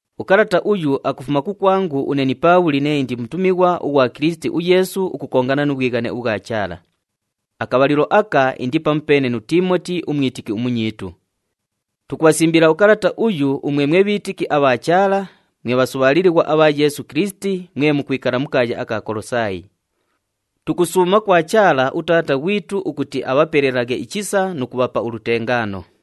Ukalata uyu akufuma kukwangu une ni Paabhuli nee indi mutumighwa ughwa Kilisiti uYeesu ukukongana nu bhwighane ubhwa Chaala. Akabhalilo aka indi pamupeene nu Tiimoti umwitiki umunyiitu. Tukubhasimbila ukalata uyu umwe mwe bhiitiki abha Chaala, mwe bhasubhaalilighwa abha Yeesu Kilisiti mwe mukwikala mu kaaya aka Kolosaayi. Tukusuuma kwa Chaala uTaata ghwitu ukuti abhapelelaghe ichisa nu kubhapa ulutengaano.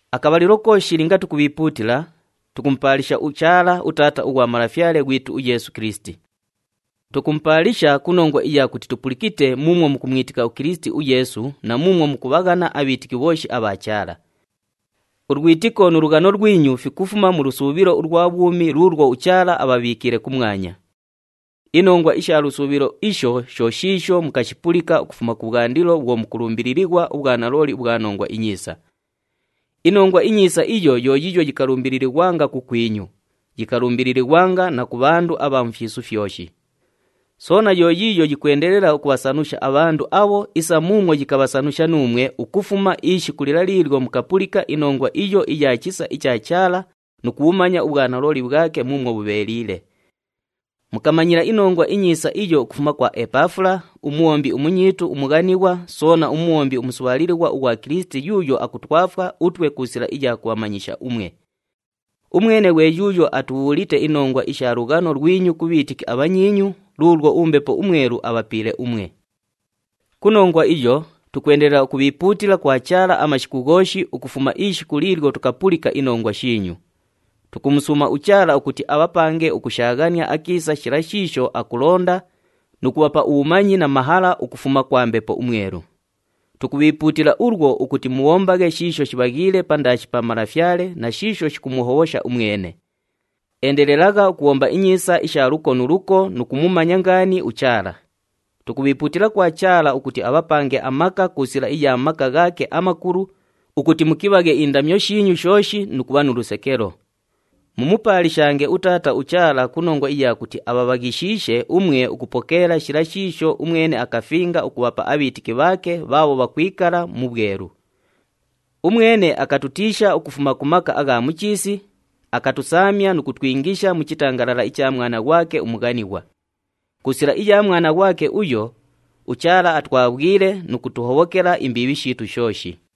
Akabhalilo kooshi linga tukubhiipuutila, tukumupaalisha uChaala, uTaata ughwa Malafyale ghwitu uYeesu Kilisiti. Tukumupaalisha ku nongwa iya kuti tupulikite muumwo mukumwitika uKilisiti uYeesu na muumwo mukubhaghana abhiitiki bhooshi abha Chaala. Ulwitiko nu lughano lwinyu fikufuma mu lusuubhilo ulwa bhwumi luulwo uChaala abhabhiikiile kumwanya. Inongwa isha lusuubhilo isho sho shiisho mukashipulika ukufuma kubhwandilo bhwo mukulumbililighwa ubhwanalooli ubhwa Nongwa iNyiisa. INongwa iNyiisa iyo yiiyo yikalumbililighwanga kukwinyu, yikalumbililighwanga na ku bhandu abha mu fyisu fyoshi. Soona yo yiiyo yikwendelela ukubhasanusha abhandu abho isa muumwo yikabhasanusha nuumwe ukufuma ishiku lila liilyo mukapulika inongwa iyo iya chisa icha Chaala nu kubhumanya ubhwanalooli bhwake muumwo bhubheeliile. Mukamanyila iNongwa iNyiisa iyo ukufuma kwa Epafula, umubhombi umunyiitu umughanighwa soona mubhombi umusubhaalilighwa ughwa Kilisiti yuuyo akutwafwa utwe ku sila iya kubhamanyisha umwe. Umwene ghwe yuuyo atubhuulite inongwa isha lughano lwinyu ku bhiitiki abhanyiinyu luulwo uMbepo uMwelu abhapiile umwe. Ku nongwa iyo, tukwendelela ukubhiipuutila kwa Chaala amashiku ghooshi ukufuma ishiku liilyo tukapulika inongwa shiinyu. Tukumusuuma uChaala ukuti abhapange ukushaaghania akiisa shila shiisho akulonda nu kubhapa ubhumanyi na mahala ukufuma kwa Mbepo uMwelu. Tukubhiipuutila ulwo ukuti mubhombaghe shiisho shibhaghiile pandaashi pa Malafyale na shiisho shikumuhobhosha umwene. Endelelagha ukubhomba inyiisa isha luko nu luko nu kumumanya ngaani uChaala. Tukubhiipuutila kwa Chaala ukuti abhapange amaka ku sila iya maka ghaake amakulu ukuti mukibhaghe indamyo shiinyu shooshi nu kubha nu lusekelo. Mumupaalishange uTaata uChaala ku nongwa iya kuti abhabhaghishiishe umwe ukupokeela shila shiisho umwene akafinga ukubhapa abhiitiki bhaake bhaabho bhakwikala mu bhwelu. Umwene akatutiisha ukufuma ku maka agha mu chiisi, akatusaamya nu kutwingisha mu chitangalala icha Mwana ghwake umughanighwa. Ku sila iya Mwana ghwake uyo, uChaala atwabhwile nu kutuhobhokela imbiibhi shiitu shooshi.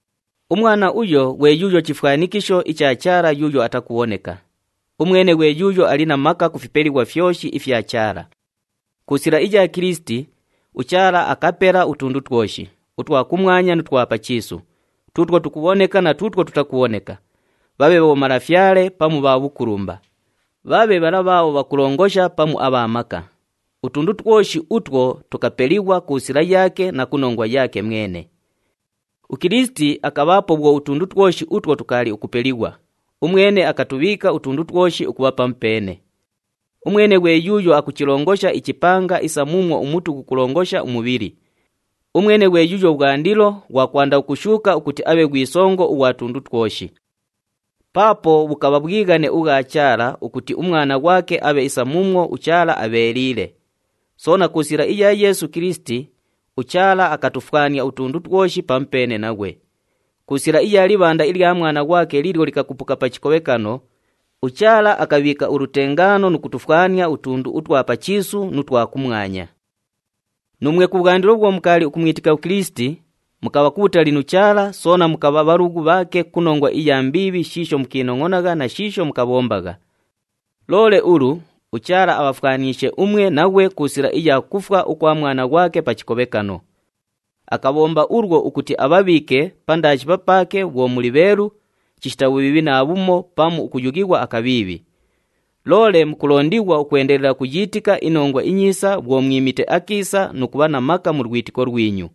UMwana uyo ghwe yuuyo chifwanikisho icha Chaala yuuyo atakubhoneka. Umwene ghwe yuuyo ali na maka ku fipelighwa fyoshi ifya Chaala. Ku sila iya Kilisiti, uChaala akapela utundu twoshi, utwa kumwanya nu twa pa chiisu, tuutwo tukubhoneka na tuutwo tutakubhoneka, bhabhe bhomalafyale pamu bhukulumba, bhabhe bhala bhaabho bhakulongosha pamu abha maka. Utundu twoshi utwo tukapelighwa ku sila yaake na ku nongwa yaake mwene. UKilisiti akabhaapo bhwo utundu twoshi utwo tukaali ukupelighwa, umwene akutubhiika utundu twoshi ukubha pamupeene. Umwene ghwe yuuyo akuchilongosha ichipanga isa muumwo umutu ghukughulongosha umubhili. Umwene ghwe yuuyo bhwandilo, ghwa kwanda ukushuuka ukuti abhe ghwi songo ughwa tundu twoshi. Paapo bhukabha bhwighane ubhwa Chaala ukuti uMwana ghwake abhe isa muumwo uChaala abheeliile. Soona ku sila iya Yeesu Kilisiti, uChaala akatufwania utundu twoshi pamupeene naghwe. Ku sila iya libhanda ilya Mwana ghwake liilyo likakupuka pa chikobhekano, uChaala akabhiika ulutengaano nu kutufwania utundu utwa pa chiisu nu twa kumwanya. Nuumwe kubhwandilo bhwo mukaali ukumwitika uKilisiti, mukabha kubhutali nu Chaala soona mukabha bhalughu bhaake ku nongwa iya mbiibhi shiisho mukiinongʼonagha na shiisho mukabhombagha. Loole ulu, uChaala abhafwaniishe umwe naghwe ku sila iya kufwa ukwa Mwana ghwake pa chikobhekano. Akabhomba ulwo ukuti abhabhiike pandaashi papaake bhwo mwe bheelu, chishita bhubhiibhi naabhumo pamu ukuyughighwa akabhiibhi. Loole mukulondighwa ukwendelela ukuyiitika iNongwa iNyiisa bhwo mwimite akiisa nu kubha na maka mu lwitiko lwinyu.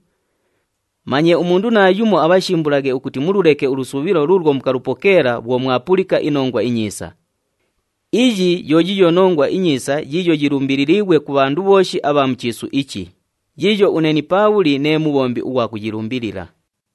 Manye umundu naayumo abhashimbulaghe ukuti mululeke ulusuubhilo luulwo mukalupokeela bhwo mwapulika iNongwa iNyiisa. Iyi yo yiiyo Nongwa iNyiisa yiiyo yilumbililiighwe ku bhandu bhooshi abha mu chiisu ichi, yiiyo une ni Paabhuli nee mubhombi ughwa kuyilumbilila.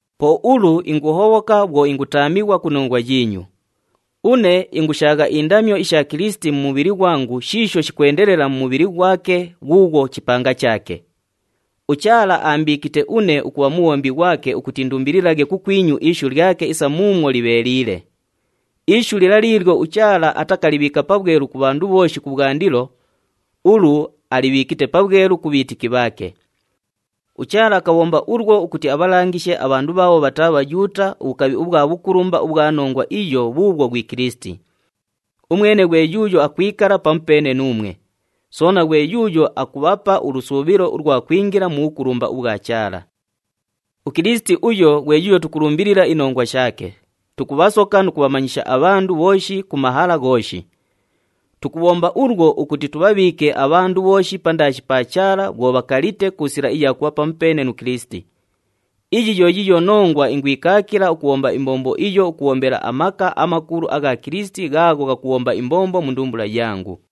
Po ulu inguhobhoka bhwo ingutaamighwa ku nongwa yiinyu. Une ingushaagha indamyo isha Kilisiti mu mubhili ghwangu shiisho shikwendelela mu mubhili ghwake ghuughwo chipanga chaake. UChaala aambiikite une ukubha mubhombi ghwake ukuti indumbililaghe kukwinyu ishu lyake isa muumwo libheeliile. Ishu lila liilyo uChaala atakalibhiika pabhwelu ku bhandu bhooshi kubhwandilo, ulu alibhiikite pabhwelu ku bhiitiki bhaake. UChaala akabhomba ulwo ukuti abhalangishe abhandu bhaabho bhataa Bhayuuta ubhukabhi ubhwa bhukulumba ubhwa nongwa iyo bhuubhwo ghwi Kilisiti. Umwene ghwe yuuyo akwikala pamupeene nuumwe, soona ghwe yuuyo akubhapa ulusuubhilo ulwa kwingila mu bhukulumba ubhwa Chaala. UKilisiti uyo ghwe yuuyo tukulumbilila inongwa shaake, tukubhasoka nu kubhamanyisha abhandu bhooshi ku mahala ghooshi. Tukubhomba ulwo ukuti tubhabhiike abhandu bhooshi pandaashi pa Chaala bhwo bhakalite ku sila iya kubha pamupeene nu Kilisiti. Iyi yo yiiyo nongwa ingwikaakila ukubhomba imbombo iyo ukubhombela amaka amakulu agha Kilisiti ghaagho ghakubhomba imbombo mu ndumbula yangu.